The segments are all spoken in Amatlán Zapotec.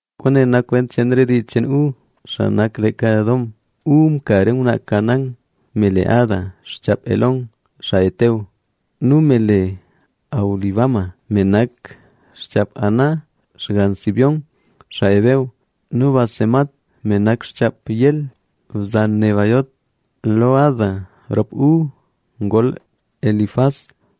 Kwaane nak kwent cheen re dii cheen Esaú, xaa nak leeka Edom. Esaú mka re ngwnaa Canaán, me le Ada, xchaap Elón xaa Het nu me le Aholibama, me nak xchaap Aná, xgann Zibeón, xaa Heveo, nu Basemat, me nak xchaap Ismael, bzan Nebaiot. Lo Ada rop Esaú ngol Elifaz,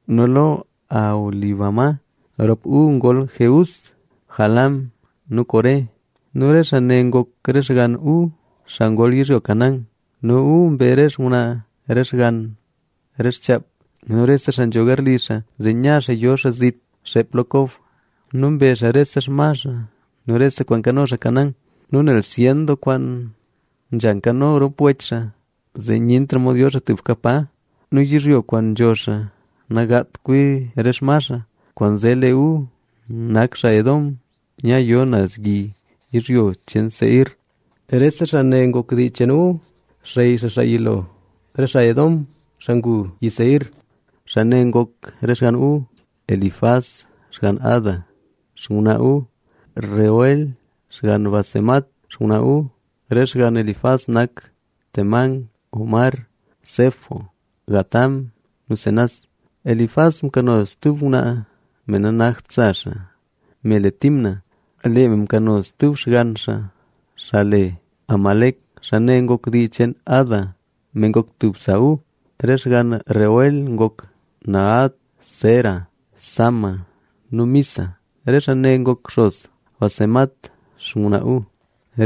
nu lo Aholibama rop Esaú ngol Jeús, Jaalam nu Coré. Nu re xaa ne ngok re xgann Esaú, xaa ngol yizhyo Canaán. Nu Esaú mbe re xngwnaa, re xgann, re xchaap nu rese xaa nzho garli xaa, zee nya xaa yo xaa zit xeep lo Kob. Nu mbe xaa rese xma xaa nu rese kwaan nkano xaa Canaán. Nu nel zyen doo kwaan nzha nkano rop wech xaa, zee nyentra mod yo xaa tubka pa. Nu yizhyo kwaan nzho xaa nagaat kwi re xma xaa. Kwaanzee lee Esaú nak xaa Edom, nyayo naz yi yizhyo cheen Seir. Rese xaa ne ngok dii cheen Esaú, xey xaa, xaa yilo re xaa Edom, xaa ngu yi Seir. Xaa ne ngok re xgann Esaú: Elifaz, xgann Ada, xngwnaa Esaú, Reuel, xgann Basemat, xngwnaa Esaú. Re xgann Elifaz nak: Temán, Omar, Zefo, Gatam, nu Cenaz. Elifaz mkano stub ngwnaa, me nanakt sa xaa, me le Timna. Lee me mkano stub xgann xaa, xaa le: Amalec, xaa ne ngok dii cheen Ada, me ngok tub sa Esaú. Re xgann Reuel ngok: Nahat, Zera, Sama nu Miza. Re xaa ne ngok xos Basemat, xngwnaa Esaú.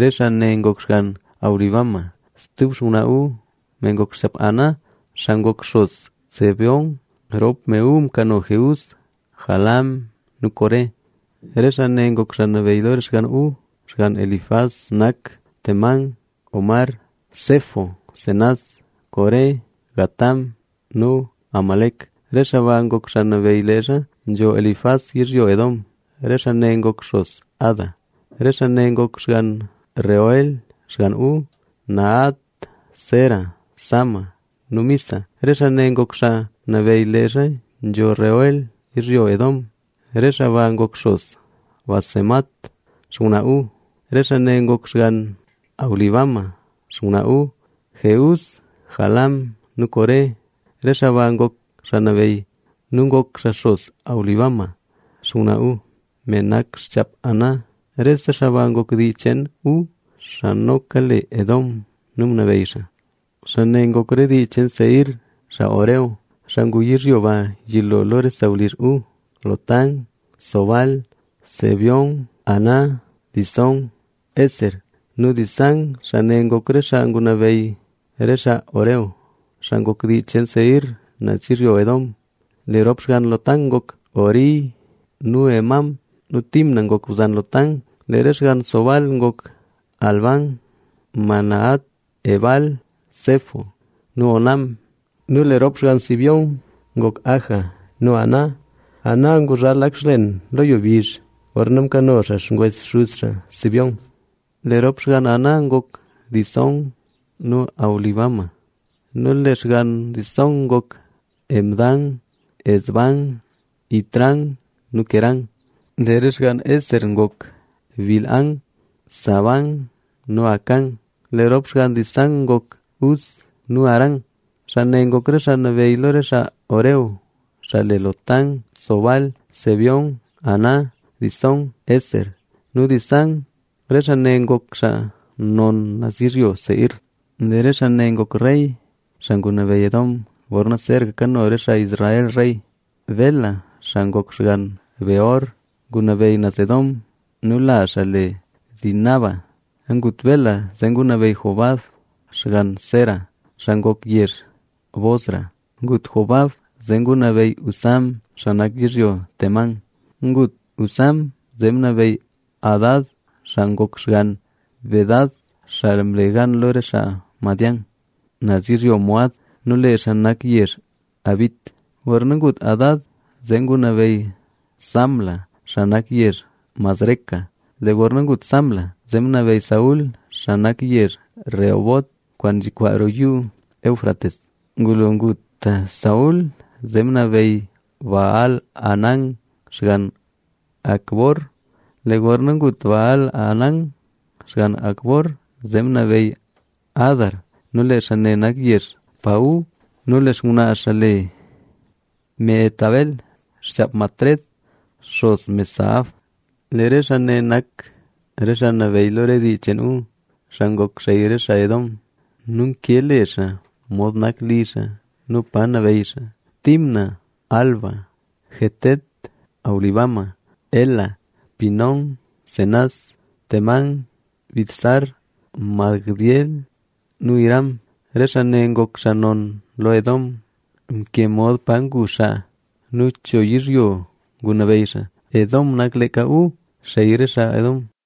Re xaa ne ngok xgann Aholibama, stub xngwnaa Esaú, me ngok xchaap Aná, xaa ngok xos Zibeón. Rop me Esaú mkano: Jeús, Jaalam nu Coré. Re xaa ne ngok xaa nabeyy lo re xgann Esaú. Re xgann Elifaz, xaa yilo lo Usaú nak: Temán, Omar, Zefo, Cenaz, Coré, Gatam nu Amalec. Re xaa ba ngok xaa nabeyy leezha nzho Elifaz yizhyo Edom. Re xaa ne ngok xos Ada. Re xaa ne ngok xgann Reuel, xgann Esaú: Nahat, Zera, Sama nu Miza. Re xaa ne ngok xaa nabeyy leezha nzho Reuel yizhyo Edom, re xaa ba ngok xos Basemat, xngwnaa Esaú. Nu re xaa ne ngok xgann Aholibama, xngwnaa Esaú: Jeús, Jaalam nu Coré. Re xaa ba ngok xaa nabeyy nu ngok xaa xos Aholibama, xngwnaa Esaú, me nak xchaap Aná. Rese xaa ba ngok dii cheen Esaú (xaa noka le Edom) nu ngunabeyy xaa. Xaa ne ngok re dii cheen Seir, xaa Horeo, xaa ngu yizhyo ba yilo lo re sawlizh Esaú: Lotán, Sobal, Zibeón, Aná, Disón, Ezer nu Disán. Xaa ne ngok re xaa ngunabeyy re xaa Horeo, xaa ngok dii cheen Seir, naz yizhyo Edom. Lee rop xgann Lotán ngok Hori nu Hemam. Nu Timna ngok bzan Lotán. Lee re xgann Sobal ngok: Alván, Manahat, Ebal, Sefo nu Onam. Nu lee rop xgann Zibeón ngok Aja nu Aná. Aná nguzhal lak xlen lo yizhyo bizh, gorna mkano xaa xngwes xuz xaa Zibeón. Lee rop xgann Aná ngok Disón nu Aholibama. Nu lee xgann Disón ngok: Hemdán, Esbán, Itrán nu Querán. Lee re xgann Ezer ngok: Bilhán, Zaaván nu Acán. Lee rop xgann Disán ngok: Uz nu Arán. Xaa ne ngok re xaa nabeyy lo re xaa Horeo, xaa le: Lotán, Sobal, Zibeón, Aná, Disón, Ezer nu Disán. Re xaa ne ngok xaa non naz yizhyo Seir. Lee re xaa ne ngok rey, xaa ngunabeyy Edom, gorna zeeraka kano re xaa Israel rey. Bela, xaa ngok xgann Beor ngunabeyy naz Edom nu lazh xaa le Dinaba. Ngut Bela, zee ngunabeyy Jobab xgann Zera, xaa ngok xaa yezh Bosra. Ngut Jobab, zee ngunabeyy Husam, xaa nak yizhyo Temán. Ngut Husam, zee ngunabeyy Hadad, xaa ngok xgann Bedad, xaa mle gan lo re xaa Madián naz yizhyo Moab. Nu lee xaa nak yezh Avit. Gorna ngut Hadad, zee ngunabeyy Samla, xaa nak yezh Masreca. Lee gorna ngut Samla, zee ngunabeyy Saúl, xaa nak yezh Rehobot, kwaan nzhikwaa roo Yuu Éufrates. Ngulo ngut Saúl, zee ngunabeyy Baal-hanán xgann Acbor. Lee gorna ngut Baal-hanán xgann Acbor, zee ngunabeyy Hadar nu lee xaa nak yezh Pau nu lee xngwnaa xaa le Mehetabel, xchaap Matred, xos Mezaab. Lee re xaa ne nak re xaa nabeyy lo re dii cheen Esaú, xaa ngok xey re xaa Edom. Nu mkee le xaa, mod nak li xaa nu pa nabeyy xaa: Timna, Alva, Jetet, Aholibama, Ela, Pinón, Cenaz, Temán, Mibzar, Magdiel nu Iram. Re xaa ne ngok xaa non lo Edom nu mod nak yizhyo pa ngu xaa. Edom nak leeka Esaú, xey re xaa Edom.